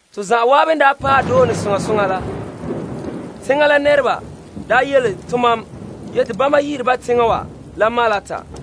To zan'an n daa paɛ doone soŋa soŋa la, teŋa la nɛreba yele tomam te bama yi'ire ba teŋa wa la Malta.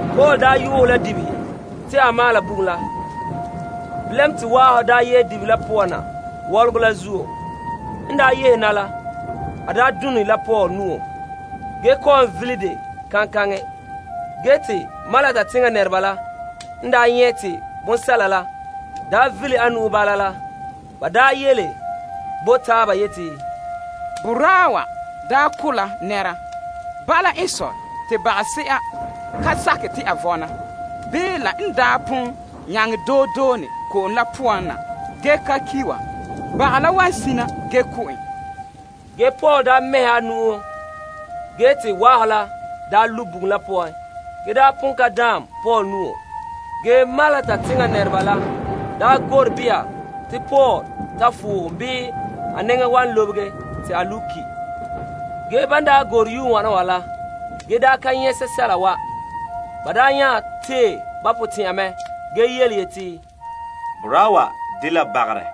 Paul n yuhɛ la dibehe te a maala bugum la, te waahɔ yehe dibehe la poan na wɔlɔgɔ la zuo la done la Paul nu'o ge kɔ'ɔn vele dɛ kaŋkaŋɛ. Malta nɛreba la n daa nyɛ' te bonsɛla la daa vele a nu'o bala la ba yele bo taaba yeti, Boraa wa daa ko' la nɛra. Bala n sɔe te bagase'a ka sakɛ te a vɔna bii la n pon nyaŋɛ doe done ko'om la poan na ge ka ki' wa, baga la wan sina ge ko' en. Ge Paul mɛhɛgɛ a nu'o ge te waahɔ la lu' bugum la poan ge pon ka daan Paul nu'o. Malta nɛreba la gure beha te Paul ta fohom bii a nɛŋa wan lobege te a lu' teŋa ki'. Te ban gure yue wana wa la ge ka nyɛ' sɛsɛla wa, ba nya tee ba potɛn'ya mɛ ge yeti, Boraa wa dela bagarɛ.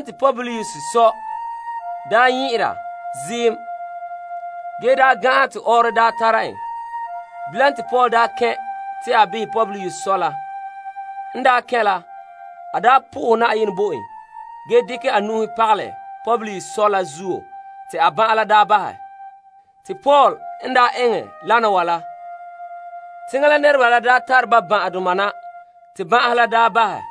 Publius sɔ nyɛ'ɛra mɛ ge gan'an te ɔɔrɔ tara en. Paul n kɛn' te a behɛ Publius sɔ la, te a po'ohɛ Yenɛ bo en ge dekɛ a nu'uhen pagalɛ Publius sɔ la zuo te a ban'an la ba'ahɛ. Paul n daa eŋɛ lana wa la, teŋa la nɛreba la tare ba ban'ahedoma na te ban'ahe la ba'ahɛ.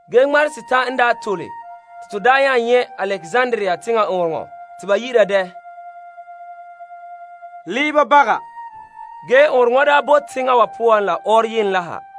Ge te ŋmarehe setan' n daa tole ge te to nya nyɛ' Alekzandria teŋa ɔɔnrɔŋɔ kantɛ te ba yi'ira dɛ Leeba Baga. Ge te ɔɔnrɔŋɔ wa bo teŋa wa poan la ɔɔrɔyenɛ la ha.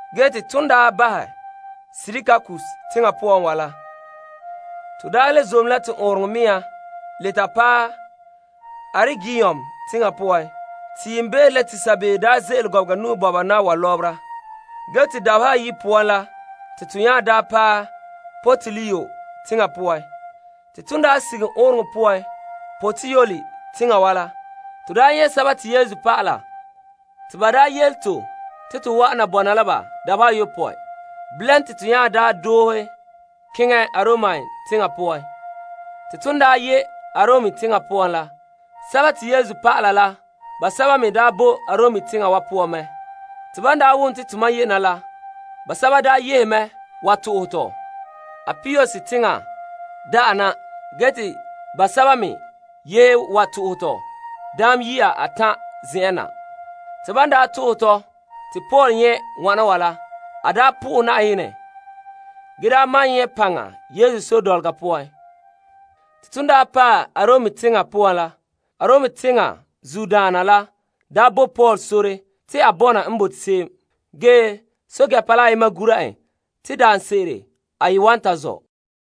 Ton daa bahɛ Sirakuse teŋa la, to le zom la to ɔɔnrɔŋɔ mea le ta paɛ Aregium teŋa poan. Te yiimbeere la te sabeeo ze'ele gɔbega nu'o bɔba na wa lɔbera ge te dabeha ayi' poan la te to nya paɛ Puteoli teŋa poan. Ton sige ɔɔnrɔŋɔ kantɛ Puteoli teŋa wa la, to nyɛ' Yesu dɔlɔba te ba yele to te to wa'an na bɔna la ba dabeha ayopɔe. Bilam te to nya doohe keŋɛ Arom teŋa poan. Te ton daa ye' Arom teŋa poan la, Yesu dɔlɔba la basɛba me boe Arom teŋa wa poan mɛ. Te ban wom te tomam ye' na la, basɛba yehe mɛ ge to'ohɛ tɔ Appius teŋa da'a na ge te basɛba me yehe to'ohɛ tɔ Daam Yiya Atan' zen'an na. Te Paul n nyɛ' wana wa la, a po'ohɛ Yenɛ ge maan nyɛ' paŋa Yesu sore dɔlɔga poan. Te ton daa paɛ Arom teŋa poan la, Arom teŋa zuodoma la bo Paul sore te a bɔna n bote se'em. Ge pɛɛntɛɛnreba la ayema gura en te daanse'ere a ye wan ta zɔ'.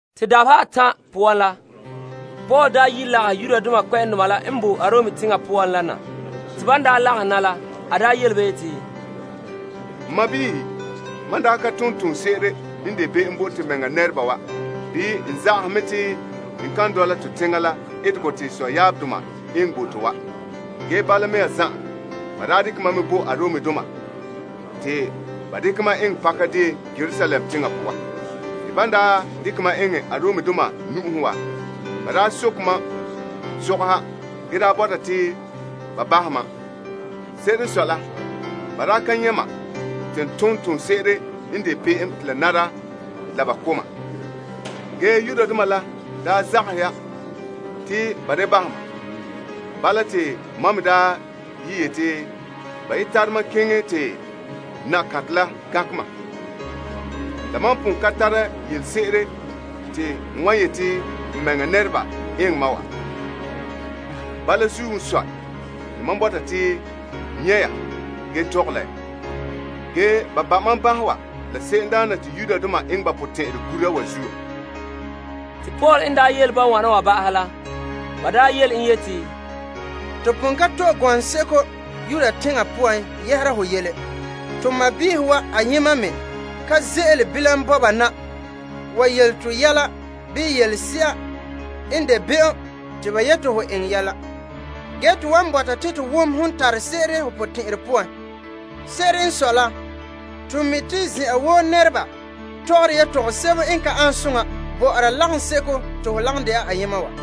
Te dabeha atan' poan la, Paul daa yi' lagahɛ Yudoma kpɛ'ɛndoma la n bo Arom teŋa poan la na. Te ban lagahɛ na la, a yele ba yeti, N sɔɔnrɔ, mam daa ka ton toonse'ere n de be'em bo to mɛŋa nɛreba wa bii n zagahɛ mɛ te n kan dɔla tɔ teŋa la etegɔ te to sɔyaabdoma eŋɛ bo to wa. Ge bala mea zan'an, ba daa dekɛ mam mɛ bo Aromdoma te ba dekɛ mam eŋɛ pakadeen Yerusalem teŋa poan. Te Aromdoma n daa soke ma sɔgɔha ge daa bɔta te ba bahɛ ma, ban daa ka nyɛ' ma te n ton toonse'ere n de be'em te la nara la ba ko' ma la zuo Yudoma n daa zagahɛ ya te ba da bahɛ ma. Bala te mam me daa ye yete ba ye tare ma keŋɛ te Kaesar la gankɛ ma. La mam pon ka tare yelese'ere te n wa yete n mɛŋa nɛreba eŋɛ ma wa. Bala zuo n sɔe te mam bɔta te n nyɛ' ya ge tɔgɛ la ya. Ge te ba ba' ma banhe wa la se'emdaana te Israeldoma eŋɛ ba potɛn'ɛrɛ gura wa zuo. Te Yudoma kpɛ'ɛndoma daa yele en yeti, Tomam pon ka to'e gɔŋseko Yudea teŋa poan yɛhera ho yele. To sɔɔnrɔ wa ayema me ka ze'ele bilam bɔna na wa yele to yɛla bii yelese'a n de be'em te ba yete hon eŋɛ ya. Ge to wan bɔta te to me wom ho n tare se'ere ho potɛn'ɛrɛ poan. Se'ere n sɔe la, to mi' te zen'an woo nɛreba tɔgɔre tɔgɔsebo n ka an soŋa bɔ'ɔra lagaŋseko te ho lagom de'a ayema wa.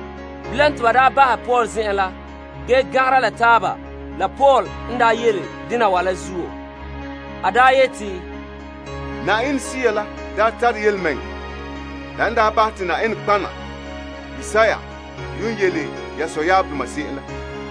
Bilam te ba bahɛ Paul zen'an la ge gan'angera la taaba la Paul n yele dena wa ma'an zuo. A yeti, Yenɛ Sea la daa tare yelemɛŋɛrɛ la n bahɛ te Yenɛ nɔtɔgɔha Isaiah yuun yele ye sɔdoma se'em la,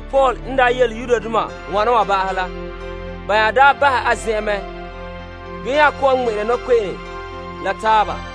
Paul n daa yele Yudoma wana wa ba'ahɛ la, ba nya daa bahɛ a zen'an la mɛ ge nya kɔ'ɔn ŋmɛ'ɛra nɔkpe'ene zo'e zo'e la taaba.